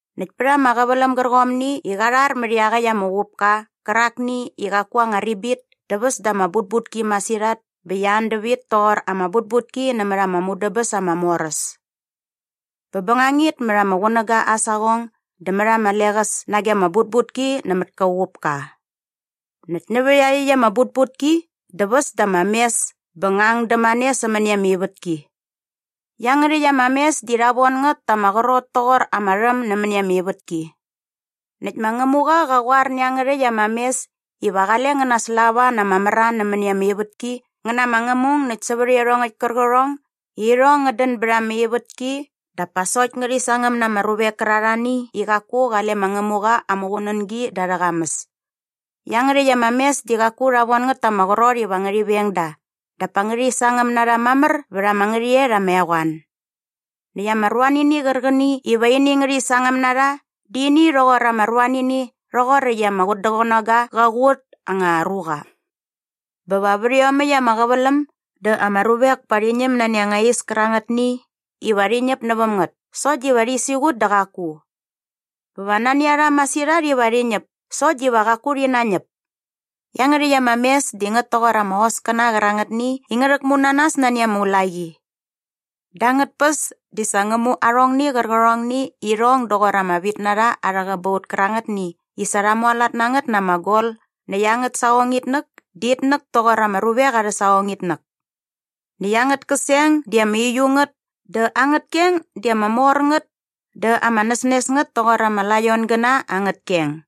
Näkt pät ama qäväläm gärqomni i qa rhar mät iaqäkt ama uqupka qärakni i qaku aa anga ribit dä väs da ama butbutki masirhat bä qia an dävit toqor ama butbutki nämät ama mudäbäs ama mor äs. Bä bängangit mät ama qunäga aa saqong dä mät ama leqäs nage ama butbutki nämät kä uqupka. Näkt nävä iaqyäkt ama butbutki dä väs da ama mes bä ngä ang dämane sämäni ama ivätki. Iangärhäkt ama mes di rha von ngät ta ama qrot toqor ama rhäm nämäni ama ivätki. Näkt ma Ngämuqa qa qoar nä iangärhäkt ama mes iva qale ngä naslava na ama mran nämäni ama ivätki ngä na ama ngämung näkt sävät iarhongäkt kärqärhong i irhong ngät dän bät ama ivätki dap pa sokt ngärhi sangäm na ama ruvek kärarhani i qaku qale ma Ngämuqa aa muqunängi da arhä qamäs. Iangärhäkt ama mes di qaku rha von ngät ta ama qrot iva ngärhi veng da dap pa ngärhi sangäm na rha mamär vät ama ngärhäqyet ama eqoan. Näkt ama ruanini qärqäni iva ini ngärhi sangäm na rha di ini rhoqor ama ruanini rhoqoräkt i ama qutdäqänoga qa qut anga ruqa. Bä va vät iomäkt ama qäväläm dä ama ruvek pa rhi ñäm nani anga is kärangätni iva rhi ñäp näväm ngät sokt diva rhi siqut dä qaku. Bä va nani a rha masirhat iva rhi ñäp sokt diva qaku rhi nañäp. Iangärhäkt ama mes di ngät toqor ama hoskäna qärangätni i ngä rhäkmu na nas nani ama ulaqi. Da angät päs di sa ngä mu arhongni qärqärhongni i irhong doqor ama vitnarha arhä qäbaut kärangätni i sa rha mualat na ngät na ama gol näkt angät saqongitnäk di itnäk toqor ama ruvek arhä saqongitnäk. Näkt angät käseng di ama uiu ngät dä angät keng di ama mor ngät dä ama näsnes ngät toqor ama laiongäna angät keng.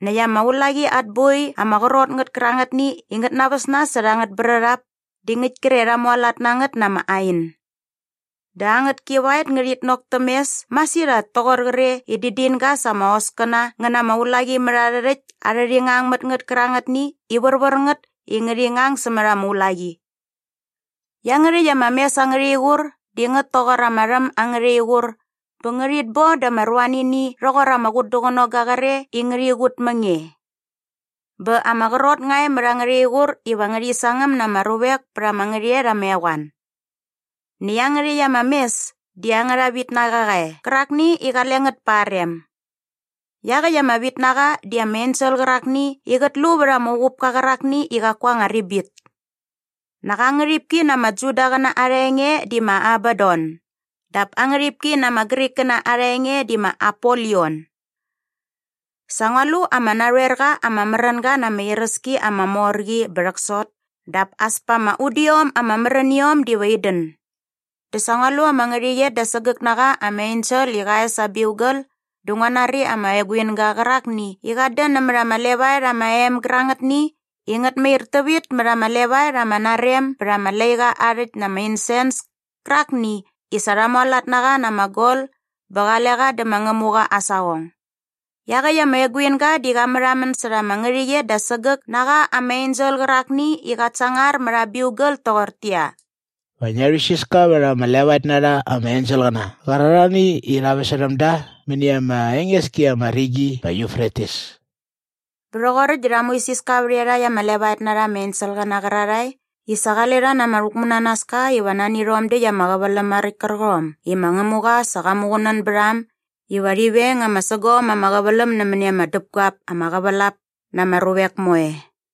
Näkt ama ulaqi at boi ama qrot ngät kärangätni i ngät naväs nas särha angät brärhap di ngäkt kre rha mualat na ngät na ama ain. Dä angät kivaet ngärhit nok täm mes masirhat toqor qre i dädinga sa ama hoskäna ngä na ama ulaqimärharhärhäkt arhä rhingangmätngät kärangätni i värvär ngät i ngärhi ngang sämät ama ulaqi. Iangärhäkt ama mes angärha iqur di ngät toqor ama rhäm angärha iqur bä ngärhit bon da ama ruanini rhoqor ama qutdäqänong gre i ngärhi qut mä nge. Bä ama qrot nga e mät angärha iqur iva ngärhi sangäm na ama ruvek pät ama ngärhäqyet ama eqoan. Näkt iangärhäkt ama mes di angärha vitnaqa qa e qärakni i qale ngät pa aa rem. Iaqäkt ama vitnaqa di ama ensel qärakni i qät lu vät ama uqupka qärakni i qaku aa anga ribit. Nak aa ngärhipki na ama Judaqäna arha enge di ma Abadon dap aa ngärhipki na ama Grikkäna arha enge di ma Apolion. Sa ngua lu ama narhoer qa ama märänga na ama iräski ama mor qi bä rhäksot dap as pa ama udiom ama märäniom diva in dän. Dä sa ngua lu ama ngärhäqyet da sägäk na qa ama ensel i qa es aa biugal dä ngua nari ama eguinga qärakni i qat dän nämät ama levaet ama em gärangätni i ngät mair tävit mät ama levaet ama narem bät ama laiqa aa rhäkt na ama insens kärakni i sa rha mualat na qa na ama gol bä qale qa dä ma Ngämuqa aa saqong. Iaqäkt ama eguinga di qa märhamän särha ama ngärhäqyet da sägäk na qa ama ensel qärakni i qat sangar mät aa biugal toqortäqyia, “Va ngia rhuisiska vät ama levaet na rha ama enselqäna qärarhani i rha väsärhäm da mäni ama enges ki ama rigi ma Yufretis.” Bä rhoqoräkt dä rha muisiska vät iarhakt ama levaet na rha ama enselqäna qärarhae i sa qale rha na ama rhäkmunanaska iva nani rhom däkt ama qäväläm maräkt kärqom i ma Ngämuqa sa qa muqunän bät a äm iva rhi veng ama sägom ama qäväläm nämäni ama däpguap ama qävälap na ama ruvek moe.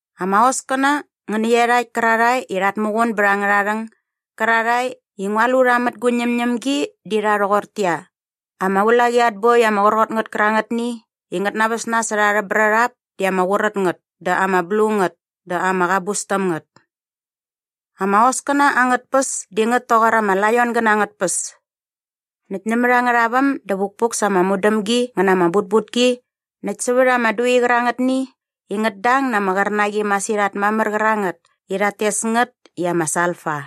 Ama hoskäna ngä nä iarhakt kärarhae i rhat muqun bät angärha rhäng gärarhae i ngua lu rha mät gu ñämñämgi di rha rhoqortäqyia, ama ulaqi at boi ama qrot ngät kärangätni i ngät naväs nas särha arhä brärhap di ama qurät ngät dä ama blu ngät dä ama qabus täm ngät. Ama hoskäna angät päs di ngät toqor ama laiongäna angät päs. Näkt nämät angärha väm dä vukpuk sa ama mudämgi ngä na ama butbutki näkt sävät ama dui qärangätni i ngät dang na ama qärnaqi masirhat mamär qärangät i rhat tes ngät i ama salfa.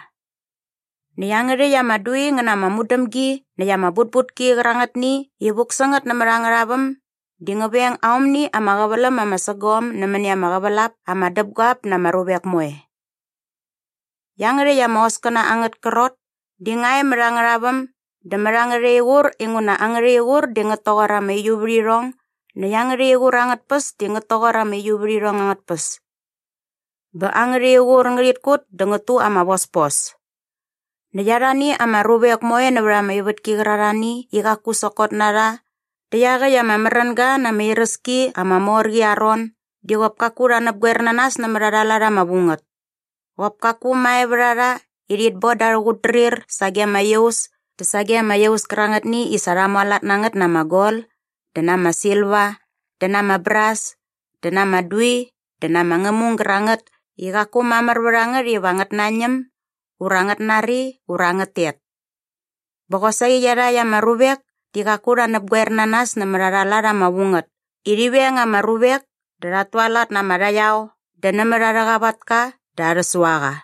Näkt iangärhäkt ama dui ngä na ama mudämgi näkt ama butbutki qärangätni i vuk sä ngät nämät angärha väm di ngä veng aomni ama qäväläm ama sägom nämäni ama qävälap ama däpguap na ama ruvek moe. Iangärhäkt ama hoskäna angät krot di nga e mät angärha väm dä mät angärha iqur inguna angärha iqur di ngät toqor ama uiuvärhirhong näkt angärha iqur angät päs di ngät toqor ama uiuvärhirhong angät päs. Bä angärha iqur ngärhit kut dä ngät tu ama vospos. Näkt arhani ama ruvek moe nävät ama ivätki qärarhani i qaku sokot na rha dä iaqäkt ama märänga na ama iräski ama mor qi aa ron di qop kaku rha näpqoer na nas nämät arha lat ama vu ngät. Qop kaku mae vät a rha i rhit bon da arhä qutdrir sage ama iaus dä sage ama iaus kärangätni i sa rha mualat na ngät na ama gol dä na ama silva dä na ama bras dä na ama dui dä na ama ngämung gärangät i qaku mamär vät a ngät iva ngät nañäm ura ngät nari ura ngät tet. Bä qosaqi iarhakt ama ruvek di qaku rha näpgoer na nas nämät arha lat ama vu ngät i rhi veng ama ruvek dä rhat tualat na ama rhaqyao dä nämät arhä qavatka dä arhä suaqa.